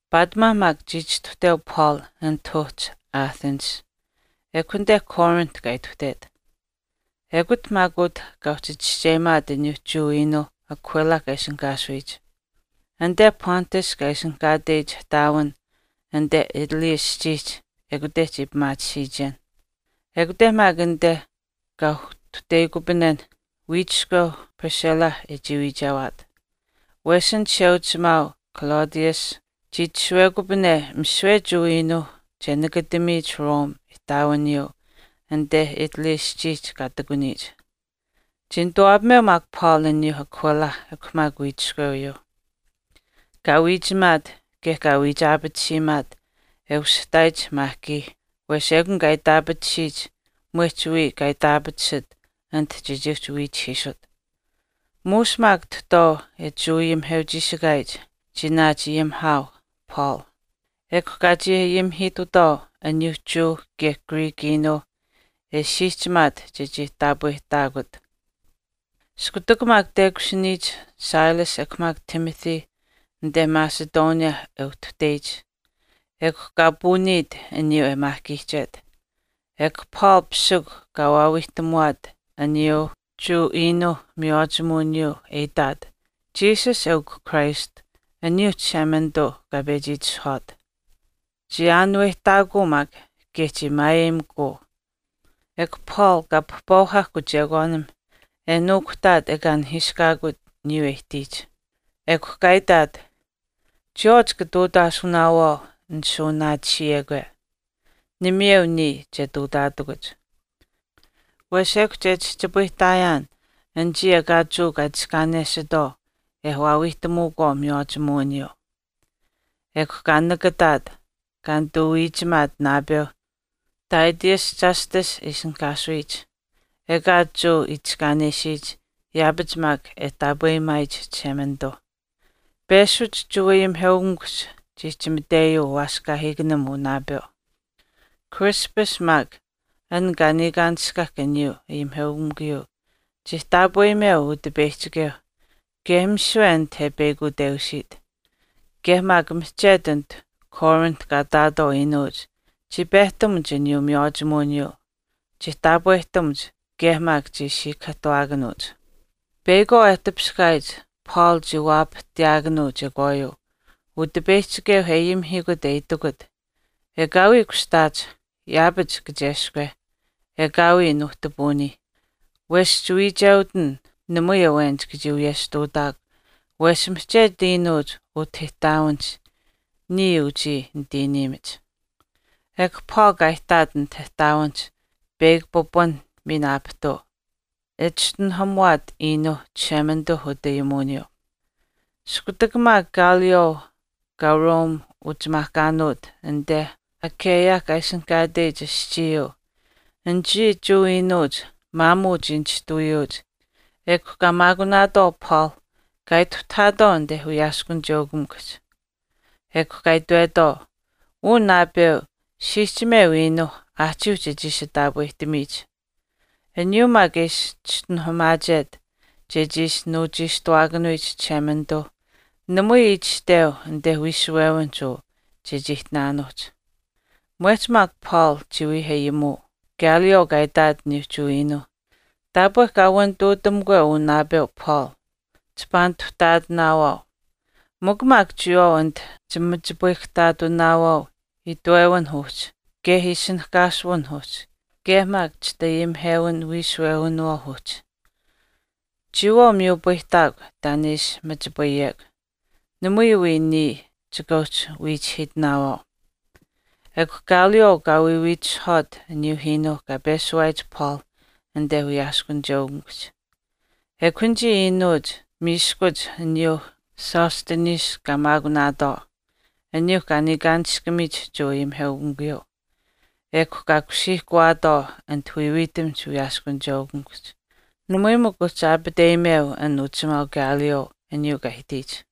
Paatimaa maak chii chistuhteu Paul anit uhchi Athensihch, ekw anite Corinth kaa ituhtet. Ekut maak utah kaa uhchi chischeyimaat aniyuu Jewa iinuuh Aquila kaa ishinihkaasuyich. Anite Pontus kaa ishinihkaatech ihtaawin anite Italy aschiihch ekute chii pimaatisiichen. Ekute maak anite kaa uhtuhteyikupanen, wiichiskweu Priscilla e chii wiichewaat, wesh an chisheuchimaau Claudius chii itashuwekupane misiwe Jewa iinuuh che nakatamiyich Rome ihtaawiniyuu anite Italy aschiihch kaa ihtakuniyich. Chii nituwaapameu maak Paul uyuu Aquila ekw maak wiichiskwewiyuu. Kaa wiichimaat kaye kaa wiichaapatisiimaat e ushihtaayich maahkii wesh ekun kaa itaapatisiyich mwehch wiya kaa itaapatisit anit chechii uhchi wiichihiisut. Muush maak tahtwaau e Jewa ayimiheuchiishikaayich chii naachayimihaau Paul ekw kaa chii ayimihiitutwaau aniyuu Jewa kaye Greek iinuu e siihchimaat chechii taapwehtaakut. Iskutak maak tekushiniyich Silas ekw maak Timothy anite Macedonia e uhtuhteyich, ekw kaa puuniit aniyuu e maahkiihchet. Ekw Paul pisikw kaa waawiihtamuwaat aniyuu Jewa iinuu miywaachimuwiniyuu e itaat, Jesus eukw Christ aniyuu Chishemanituu kaa pechi itishahwaat. Chii aanuwehtaakuu maak kaye chii maayeyimikuu ekw Paul kaa pahpauhahk uchekwaanim e nuukuhtaat ekaa nihiishkaakut aniyuu e ihtiyich. Ekw kaa itaat, “Chiyawaau chika ihtuutaasunaawaau nishuuwanaatisiyekwe, namayeu niya che ihtuutaatakuch. Wesh ekw che chihchipayihtaayaan anichii ekaa Jewa kaa itiskaanesitwaau e waawiihtamuukwaau miywaachimuwiniyuu.” Ekw kaa nakataat, kaa nituu wiichimaat naapeu Titius Justus e ishinihkaasuyich, ekaa Jewa itiskaanesiyich yaapach maak e taapweyimaayich Chishemanituu. Peshuch Jewa ayimiheukamikuhch chii chimateyuu uwaaskaahiikanim uu naapeu. Crispus maak, an kaa niikaanishkahk aniyuu ayimiheukamikuyuu chii taapweyimeu Utipeyihchikeu, kaye misiwe aniyuuh anit e peyakuteusiit. Kaye maak mihchetu anit Corinth kaa ihtaatwaau iinuuch chii pehtamuch aniyuu miywaachimuwiniyuu. Chii taapwehtamuch kaye maak chii siikahaahtuwaakanuuch. Peyakwaau e tipiskaayich Paul chii waapahtiyaakanuu chekwaayuu, Utipeyihchikeu e ayimihiikut e itikut, “Ekaawii kushtaach, yaapach kacheskwe, ekaawii nuuhtipuunii. Wesh chiwiicheutin. Namui awen chika chii wiyesh ihtuutaakw wesh mihchetu iinuuch utah ihtaawinihch niya anichii nitiiniimach.” Ekw Paul kaa ihtaat anit ihtaawinihch peyakw pipun miin aapihtuu, e chischinuhamuwaat iinuu Chishemanituu utayimuwiniyuu. Iskutak maak Gallio kaa Rome uchimaahkaanuut anite Achaia kaa ishinihkaateyich aschiiyuu anichii Jewa iinuuch maamuu chii nishtuwiyuuch ekw kaa maakunaatwaau Paul kaa ituhtahaatwaau anite wiyaaskunicheukamikuhch. Ekw kaa itwetwaau, “Uu naapeu siihchimeu iinuu aahchiiuh chechii ishi taapwehtamiyich, aniyuu maak e ishi chischinuhamaachet chechii ishi nuuchiishtuwaakanuyich Chishemanituu namui itashteu anite wiishuwewinihch uu chechii ihtinaanuuhch.” Mwehch maak Paul chii wii ayimuu, Gallio kaa itaat aniyuu Jewa iinuu, “Taapwe kaa wanituutamukwe uu naapeu Paul, chipaa nituhtaatinaawaau. Mikw maak chiyawaau anit chimachipayihkahtaatunaawaau itwewinh uhchi kaye ishinihkaasuwinh uhchi kaye maak chitayimihewin wiishuwewinawaauh uhchi. Chiyawaau miyupayihtaakw taan e ishi machipayekw, namui wii niya chika uhchi wiichihiitinaawaau.” Ekw Gallio kaa wiiwiitisuhwaat aniyuu iinuu kaa peshuwaayich Paul anite wiyaaskunicheukamikuhch. Ekw anichii iinuuch miiskuch aniyuu Sosthenes kaa maakunaatwaau, aniyuu kaa niikaanishkamiyich Jewa ayimiheukamikuyuu, ekw kaa kusiihkuwaatwaau anit wiiwiitamihch wiyaaskunicheukamikuhch. Namui mikw uhchi aapateyimeu an uchimaau Gallio aniyuu kaa ihtiyich.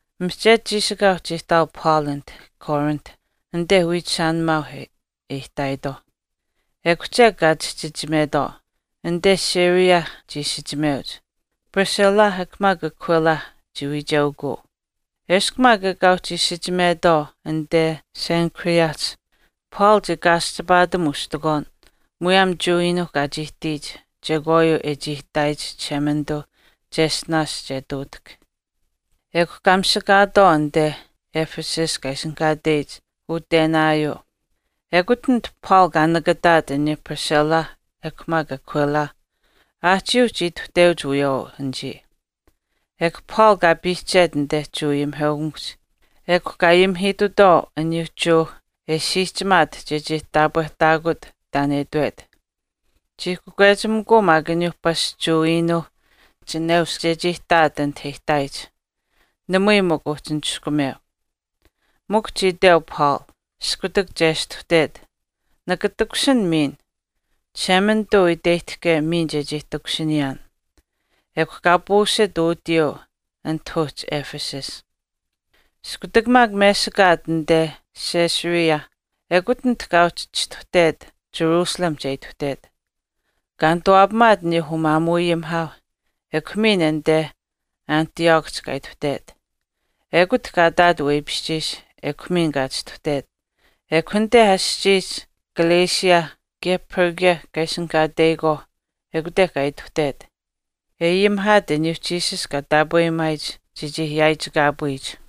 Mihchetu chiishikaau chii ihtaau Paul anit Corinth anite wiichishaanimaauh e ihtaayitwaauh. Ekw chek kaa chihchichimetwaau, anite Syria chii isichimeuch, Priscilla ekw maak Aquila chii wiicheukuu. Eshkw maak ekaa uhchi isichimetwaau anite Cenchreaehch, Paul chii kaaschipaatam ustikwaan muyaam Jewa iinuu kaa chii ihtiyich chekwaayuu e chii itaayich Chishemanituu cheshtinaash che ihtuutahk. Ekw kaa misakaatwaau anite Ephesus kaa ishinihkaateyich utenaayuu, ekut anit Paul kaa nakataat aniyuu Priscilla ekw maak Aquila, aahchiiuh chii ituhteuch wiyawaau anichii. Ekw Paul kaa piihchet anite Jewa ayimiheukamikuhch ekw kaa ayimihiitutwaau aniyuu Jewa e siihchimaat chechii taapwehtaakut taan e itwet. Chii kakwechimikuu maak aniyuu pasch Jewa iinuuh chineush chechii ihtaat anite e ihtaayich, namui mikw uhchi niskumeu. Mikw chii iteu Paul, iskutak chestuhtet, “Nika takushin miin, Chishemanituu iteyihtahke miin chechii takushiniyaan.” Ekw kaa puusit utiyuu anit uhchi Ephesus. Iskutak maak mesikaat anit Caesarea, ekut anit kaa uhchi chistuhtet Jerusalemihch e ituhtet, kaa nituwaapamaat aniyuu umaamuuayimihaauh ekw miin anite Antiochihch kaa ituhtet. Ekut kaa ihtaat weipishchiish ekw miin kaa chistuhtet. Ekw anite aschiihch Galatia kaye Phrygia kaa ishinihkaateyikwaauh ekute kaa ituhtet, e ayimihaat aniyuu Jesus kaa taapweyimaayich chechii yaaichikaapuyich.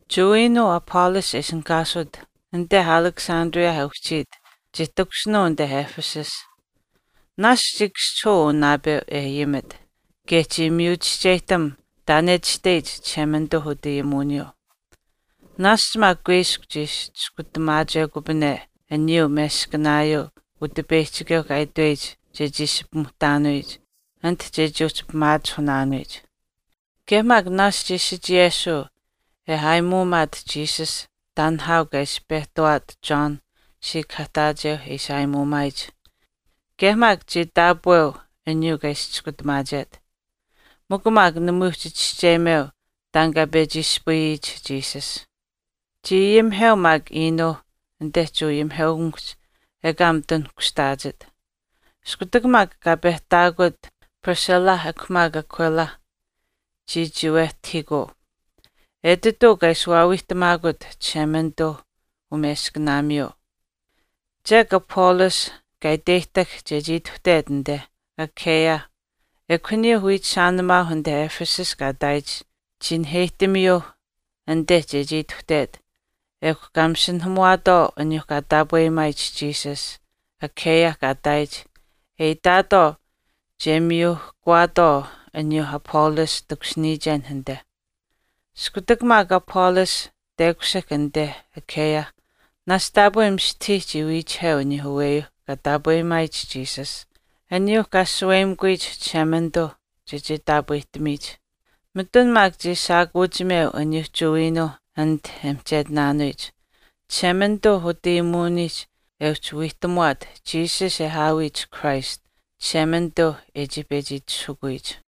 Jewa iinuu Apollos e ishinihkaasut anite Alexandria e uhchiit chii takushinuu anite Ephesus. Naashch chii kaschihuu uu naapeu e ayimit, kaye chii miyu chischeyihtam taan e itashteyich Chishemanituu utayimuwiniyuu. Naashch maak kuiskw chii ishi chiskutamuwaakanuukupane aniyuu meskanaayuu Utipeyihchikeu kaa itweyich chechii ishi pimuhtaanuyich anit chechii uhchi pimaachihunaanuyich. Kaye maak naashch chii sichiyesuu e aayimuumaat Jesus taan nihaau kaa ishi pehtawaat John siikahaahtaacheu e ishi aayimuumaayich kaye maak chii taapweu aniyuu kaa ishi chiskutamaachet. Mikw maak namui uhchi chischeyimeu taan kaa pechi ispayiyich Jesus. Chii ayimiheu maak iinuu anite Jewa ayimiheukamikuhch ekaa mitun kushtaachit. Iskutak maak kaa pehtaakut Priscilla ekw maak Aquila, chii chiiwetahiikuu. Etituu kaa ishi waawiihtamaakut Chishemanituu umeskanaamiyuu. Chek Apollos kaa iteyihtahk chechii ituhtet anite Achaia, ekw aniyuuh wiichishaanimaauh anite Ephesus kaa ihtaayich chii naheyihtamiyuu anite chechii ituhtet ekw kaa masinahamuwaatwaau aniyuu kaa taapweyimaayich Jesus, Achaia kaa ihtaayich e itaatwaau che miyuuhkawaatwaau aniyuu Apollos takushiniyichen anite. Iskutak maak Apollos tekushihk anite Achaia, naashch taapwe mistahii chii wiichiheu aniyuu aweyuuh kaa taapweyimaayich Jesus, aniyuuh kaa shaweyimikuyich Chishemanituu chechii taapwehtamiyich. Mitun maak chii shaakuuchimeu aniyuuh Jewa iinuuh anit e mihchetinaanuyich, Chishemanituu utayimuwinihch e uhchi wiihtamuwaat Jesus e aawiyich Christ, Chishemanituuh e chii pechi itishahukuyich.